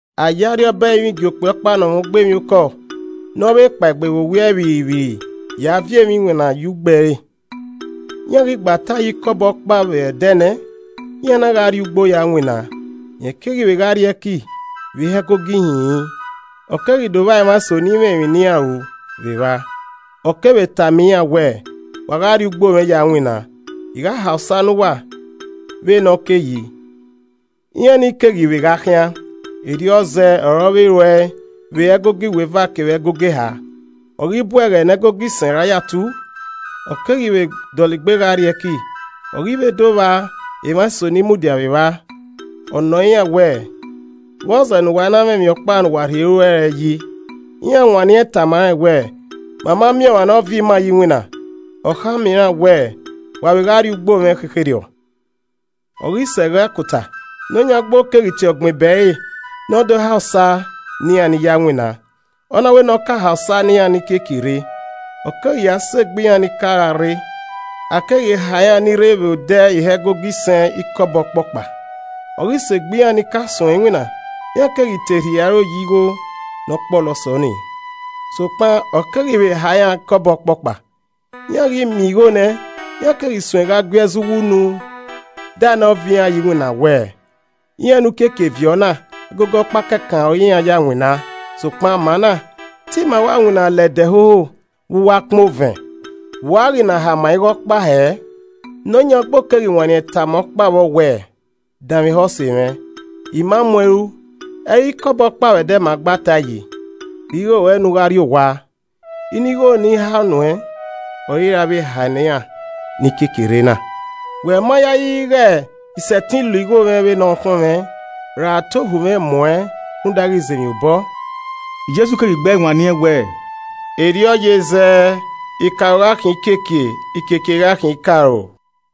“A ye Arriọba ẹrinmwi gie okpia ọkpa ne ọ mwẹ ugbo emwiokọ ne ovbe kpaegbe vbe owiẹ vbirrivbirri ya viọ emwa iwinna ye ugbo ẹre. Iran ghi gba tae ye ikọbọ ọkpa vbe ẹdẹ nẹ, iran na gha rrie ugbo ya winna. Rẹn keghi vbe gha rrie ẹki vbe ihe ẹgogo ihinrin, ọ keghi do vba emwa eso ni i mwẹ emwi ne iran ru vbe evba. Ọ kevbe tama iran wẹẹ, ‘Wa gha rrie ugbo mwẹ ya winna, I gha ha osa ne uwa vbe ne ọ ke yi.’ Iran ni keghi vbe gha khian. Erriọ zẹẹ ọre ọ vbe ru ẹe vbe ẹgogo iweva kevbe ẹgogo eha. Ọ ghi bu ẹghẹ ne ẹgogo isẹn ra ya tu, ọ keghi vbe dọlegbe gha rrie ẹki, ọ keghi vbe do vba emwa eso ni mudia vbe evba. Ọ nọ iran wẹẹ, ‘vbọzẹ ne uwa i na mwẹ emwi ọkpa ne uwa rhie ru ẹre yi?’ Iran wanniẹn tama rẹn wẹẹ, ‘Ma ma miẹn ọmwa ne ọ viọ ima ye iwinna.’ Ọ khama iran wẹẹ, ‘Wa vbe gha rrie ugbo mwẹ khekherriọ.’ “Ọ ghi sẹ ẹghẹ akota, nọyan ugbo keghi tie ọgbẹn ebe ẹre ne ọ do ha osa ne iran ni ya winna, ọ na wẹ ne ọ ka ha osa ne iran ni kiekie rre. Ọ keghi ya sẹ egbe iran ni ka gha rre. A keghi ha iran ni rre vbe odẹ ihe ẹgogo isẹn ikọbọ ọkpọkpa. Ọ ghi sẹ egbe iran ni ka suẹn iwinna, iran keghi te rhie aro ye Igho ne ọ kpọlọ sẹ ọnii, sokpan ọ keghi vbe ha iran ikọbọ ọkpọkpa. Iran ghi miẹn igho nẹ, iran keghi suẹn gha gui ẹzọ uwunu da ne ọ viọ iran ye iwinna wẹẹ, ‘Iran ne u kiekie viọ na, ẹgogo ọkpa kẹkan ọre iran ya winna, sokpan ma na, te ima wa winna la ẹdẹ hoho vbe uwu akpan ovẹn, vbe u ghi na ha ima hia igho ọkpa hẹẹ?’ Nọyan ugbo keghi wanniẹn tama ọkpa vbọ wẹẹ, ‘Danmwehọ ose mwẹ, I ma mu uẹn ru. Ẹ i re ikọbọ ọkpa vbe ẹdẹ ma gba tae yi? Rhie igho ruẹ ne u gha rrie owa. Inu igho ne I ha nu uẹn ọre I ra vbe hae ne iran ni kiekie rre na. Wẹ ma yayi ighe I sẹtin lo igho mwẹ vbe ne ọ khọnmwẹ, ra te ohu mwẹ ghi mu uẹn rhunmwuda ighe I ze emwi obọ?’” Jesu keghi gbe ẹe wanniẹn wẹẹ, “Erriọ ye zẹẹ. Ikaro gha khian ikiekie, ikiekie gha khian ikaro.”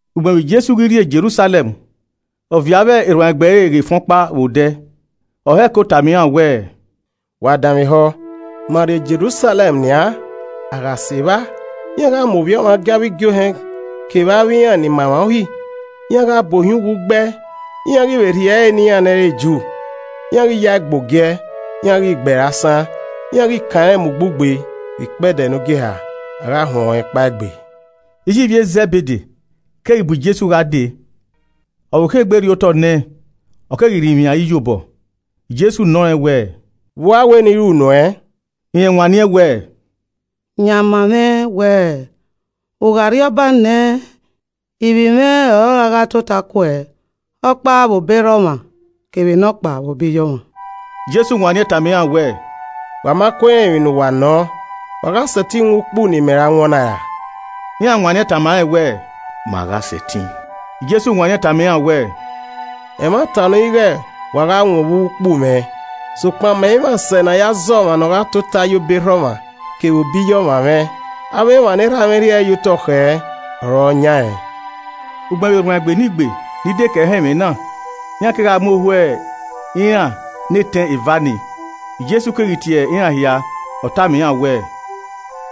Ugbẹn vbe Jesu ghi rrie Jerusalẹm, ọ viọ avbe erhuanegbe ẹre ghe efẹn ọkpa vbe odẹ, ọ hẹko tama iran wẹẹ, “Wa danmwehọ, ma rrie Jerusalẹm nian, a gha sẹ evba, iran gha mu Ovbi Ọmwa gie avbe igiohẹn kevbe avbe iran ni ma emwa Uhi, iran gha bu ohiẹn uwu gbe ẹe. Iran ghi vbe rhie ẹre ne iran ni i re Ju, iran ni gha ya ẹe gbe ogiẹ, iran ghi gbe ẹre asan, iran ghi kan rẹn mu ugbugbe, vbe ikpẹdẹ ne ogieha, a gha huẹn ọnrẹn kpaegbe.” Iye ivbi e Zẹbede keghi bu Jesu gha dee, ọ vbokho egbe rriotọ nẹẹn, ọ keghi rinmwian ẹre iyobọ. Jesu nọ rẹn wẹẹ, “Vbe u wẹ ne I ru nuẹn?” Rẹn wanniẹn wẹẹ, “Yan ma mwẹ wẹẹ, u gha rriọba nẹ ivbi mwẹ ọre ọ ra gha tota ke uẹ, ọkpa vbe obọ erha ọmwa, kevbe nọkpa vbe obọ iye ọmwa.” Jesu wanniẹn tama iran wẹẹ, “Wa ma kue rẹn emwi ne uwa nọọn. Wa gha sẹtin wọn ukpu ne imẹ ra wọn na ra.” Iran wanniẹn tama rẹn wẹẹ, “Ma gha sẹtin.” Jesu wanniẹn tama iran wẹẹ, “Ẹmwata nọ ighe wa gha wọn vbe uwu ukpu mwẹ. Sokpan, mẹ i mwẹ asẹ ne a ya zẹ ọmwa ne ogha tota ye obọ erha ọmwa kevbe obọ iye ọmwa mwẹ. Avbe emwa ne Erha mwẹ rhie ẹre ye otọ khẹ ọre ọ yan rẹn.” Ugbẹn vbe erhuanegbe ne igbe ni dekẹe họn ẹmwẹ na, iran kegha mu ohu iran ne etẹn eva nii. Jesu keghi tie iran hia, ọ tama iran wẹẹ,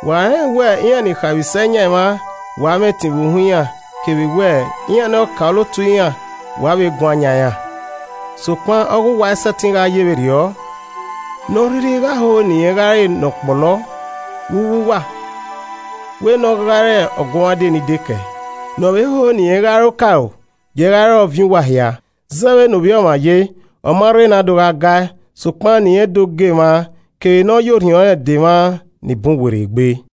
“Wa rẹnrẹn wẹ iran ni khaemwisẹ yan emwa, wa mwẹ ẹtin vbe uhunmwu iran kevbe wẹẹ, iran ne ọkaolotu iran wa guan yan iran. Sokpan ọ ghe uwa i sẹtin gha ye vberriọ. Ne ọ rhirhi gha ho ne irẹn gha re ne ọ kpọlọ vbe uwu uwa, wẹ nẹ ọ gha re ọguọmwadia ni dekẹe. Ne ọ vbe ho ne irẹn gha re okaro, giee gha re ọviẹn uwa hia. Zẹẹ vbe ne Ovbi Ọmwa ye, ọ ma rre ne a do gha ga ẹe, sokpan ne irẹn do ga emwa kevbe ne ọ ya orhiọn rẹn dẹ emwa ni bun werriegbe.”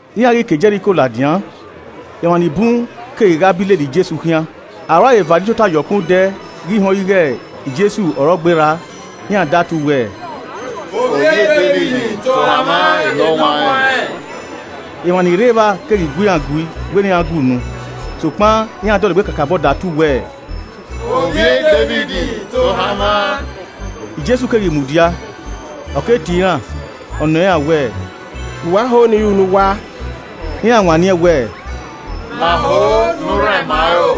Iran ghi ke Jẹriko ladian, emwa nii bun keghi gha bi lele Jesu khian. Arhu aro eva nii tota ye ọkpẹn odẹ ghi họn ighe Jesu ọre ọ gberra, iran datu wẹẹ, “Ovbi e Devid, tohan mwa enọwanrẹn.” Emwa nii rre evba keghi gu iran gui wẹ ne iran gue unu. Sokpan iran dọlegbe kakabọ datu wẹẹ, “Ovbi e Devid tohan mwa.” Jesu keghi mudia, ọ ke tie iran, ọ nọ iran wẹẹ, “Vbe uwa ho ne I ru ne uwa?” Iran wanniẹn wẹẹ, “Ma ho ne u rhan ima aro.”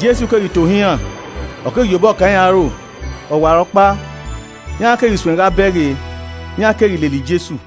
Jesu keghi tohan iran, ọ keghi ya obọ kan iran aro, ọwarọkpa, iran keghi suẹn gha bẹghe, iran keghi lele Jesu.